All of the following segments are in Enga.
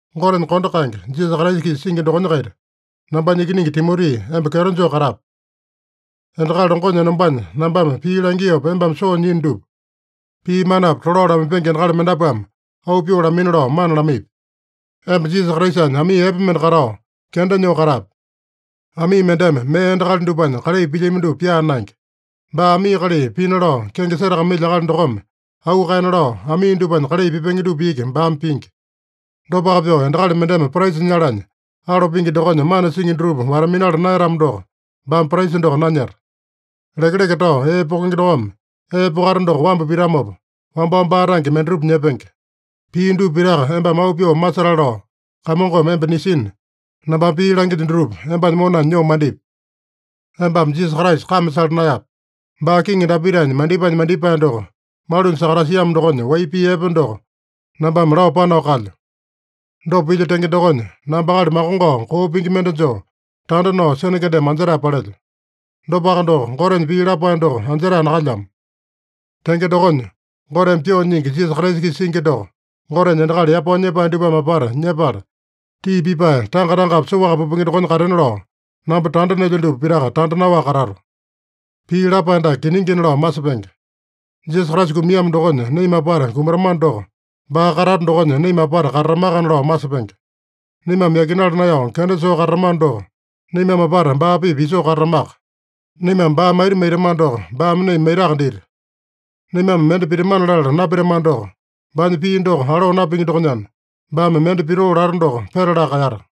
Gotenya kondo kaenge, Jisasa Kraisa-kisa singi dokonya-kaita, nambanya ikiningi Timoti, emba kyeto joo katape. Endakali longonya enombanya nambame pii langiopa embame soo nyiino dupa, pii manapi tolao lamaipenge endakali mendapuame auu pyoo lamaina lao mana lamaipi. Emba Jisasa Kraisanya amii epe mende katao, kenda nyoo katape. Amii mendeme mee endakali dupanya kalai pilyami dupa pyaa naenge. Baa amii kalai pina lao kenge setakamailya akali dokome auu kaena lao, amii dupanya kalai pipenge dupa iki baame pingi. Dopaka pyoo endakali mendeme praisa nyalanya, alo pingi dokonya mana singi dutupa wata-minala naeyatamo doko, baame praisa doko nanyeta. Lekeleke tao ee pokenge dokome ee pokata doko wambu pitamopa, wambao baa tange mendatupa nyepenge. Pii dupa pitaka embame auu pyoo masetale lao, Kamongome emba nisina, nambame pii langilyo dutupa embanya monanya nyoo mandipi. Embame Jisasa Kraisa kame sala naeyape. Baa Kiŋi Dapitanya mandipaenya mandipae doko malunya sakatasiamo dokonya wai pii epe doko nambame lao panao kalyo. Dopa pilyo tenge dokonya, namba akali makongao koo pingi mende joo, tanda nao sene kendeme anjetae palelyo. Dopaka doko, Gotenya pii lapae doko anjetae nakalyamo. Tenge dokonya, Goteme pyoo nyingi Jisasa Kraisa-kisa singi doko Gotenya endakali yapao nyepae dupame apata nyepala, tii pipae tanga-tangapi soaka pupenge dokonya katena lao, namba tanda nelyo dupa pitaka tanda naowaka katato. Pii lapae dake kiningina lao masepenge: Jisasa Kraisa kumiamo dokonya naima apata kumatamano doko, baa katata dokonya naima apata katatamakana lao masepenge. Naimame yakinala naeyao kenda soo katatamano doko, naimame apata baa-pipa isoo katatamaka. Naimame baa maita maitamano doko, baame naima maitaka dita. Naimame mende pitamana latala napitamano doko, baanya pii doko aloo napingi dokonyana, baame mende pitoo lata doko petalaka kaeyata.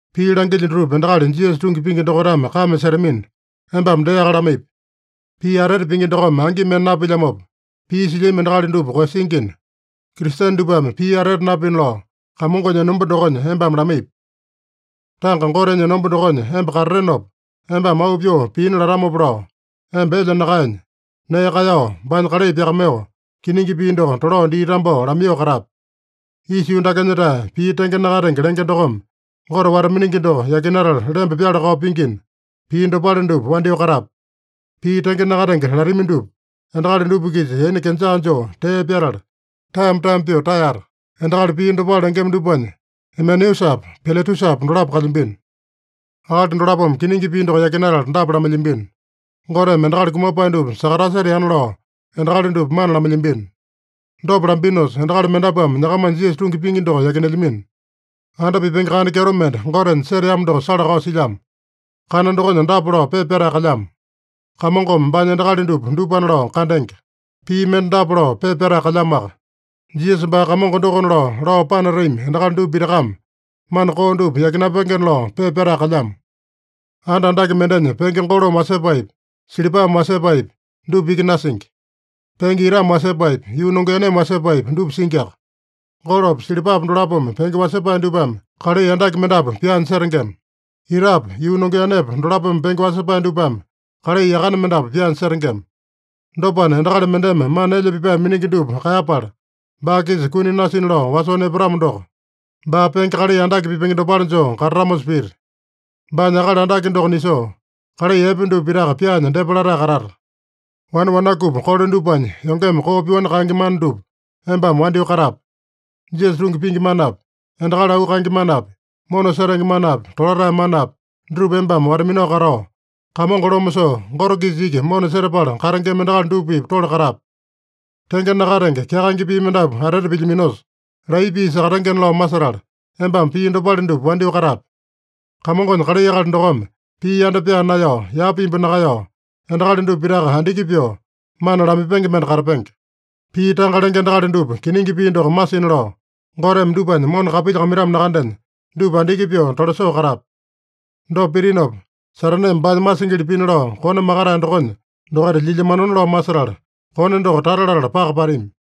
Pii langilyo dutupa endakali Jisasa tungi pingi dokaitame kame setamina, embame deaka lamaipi. Pii atete pingi dokome angi mende napilyamopa, pii silyami endakali dupa koeyasingina, Kristene dupame pii atete napina lao, Kamongonya enomba dokonya embame lamaipi. Tanga Gotenya enomba dokonya emba katatenopa, embame auu pyoo piina latamopa lao, emba elya nakaenya, nee kaeyao, baanya kalai pyakamaiyoo, kiningi pii doko tolao dii tambao lamaiyoo katape. Isa yuu dakenya-tae pii tenge nakatenge lenge dokome, Gote wata-miningi doko yakinatala lemba pyala-kao pingina, pii dopale dupa wandyoo katape. Pii tenge nakatenge latami dupa, endakali dupa-kisa yaina kenjaa joo tee pyatala, taeyama-taeyama pyoo taeyata. Endakali pii dopale lengema dupanya, Imeneusapa, Piletusapa dolapo kalyambino. Akali dolapome kiningi pii doko yakinatala dapa lamailyambino: Goteme endakali kumapae dupa sakataseteana lao endakali dupa mana lamailyambino. Dopa lambinosa, endakali mendapuame nyakamanya Jisasa tungi pingi doko yakinelyamino. Anda pipenge kana kyeto mende Gotenya seteamo doko sala-kao silyamo. Kana dokonya dapa lao pepa pyatae kalyamo: “Kamongome baanya endakali dupa, dupana lao kandenge.” Pii mende dapa lao pepa pyatae kalyamoaka: “Jisasa baa Kamongo dokona lao, lao panatami endakali dupa pitakame mana koo dupa yakinapengena” lao pepa pyatae kalyamo. Anda andake mendenya penge golome wasepaepi, silipame wasepaepi, dupa iki nasingi. Penge itame wasepaepi, yuu nongeaneme wasepaepi dupa singiaka. Golopa, silipapa dolapome penge wasepae dupame kalai andake mendapu pyaanya setengema. Itapa, yuu nongeanepa dolapome penge wasepae dupame kalai yakane mendapu pyaanya setengema. Dopana, endakali mendeme mana elya pipae miningi dupa kaeyapala, baa-kisa kuni nasina lao wasoo nepatamo doko, baa penge kalai andake pipenge dopale joo katatamosa pita. Baanya akali andake doko nisoo, kalai epe dupa pitaka pyaanya depa latae katata. Wane wanakupi kole dupanya yongeme koo pyoani kaenge mana dupa embame wandyoo katape. Jisasa tungi pingi manapi, endakali auu kaenge manapi, mona setenge manapi, tolatae manapi, dutupa embame wata-minao katao, Kamongo loma soo Gote-kisa iki mona setapala katengema endakali dupa-pipa tole katape. Tenge nakatenge, kyakaenge pii mendapu atete pilyaminosa, laiya pii sakatengena lao masetala, embame pii dopale dupa wandyoo katape. Kamongonya kalai akali dokome pii yanda pyaa naeyao, yapa imbu nakaeyao, endakali dupa pitaka andiki pyoo, mana lamaipenge mende katapenge. Pii tanga lenge endakali dupa kiningi pii doko masina lao, Goteme dupanya mona kapilyakamaitamo nakandenya, dupa andiki pyoo tolasoo katape. Dopa pitinopa, Sataneme baanya masingili pina lao kone makatae dokonya dokaita lyilyamanona lao masetala, kone doko tata latala paka patami.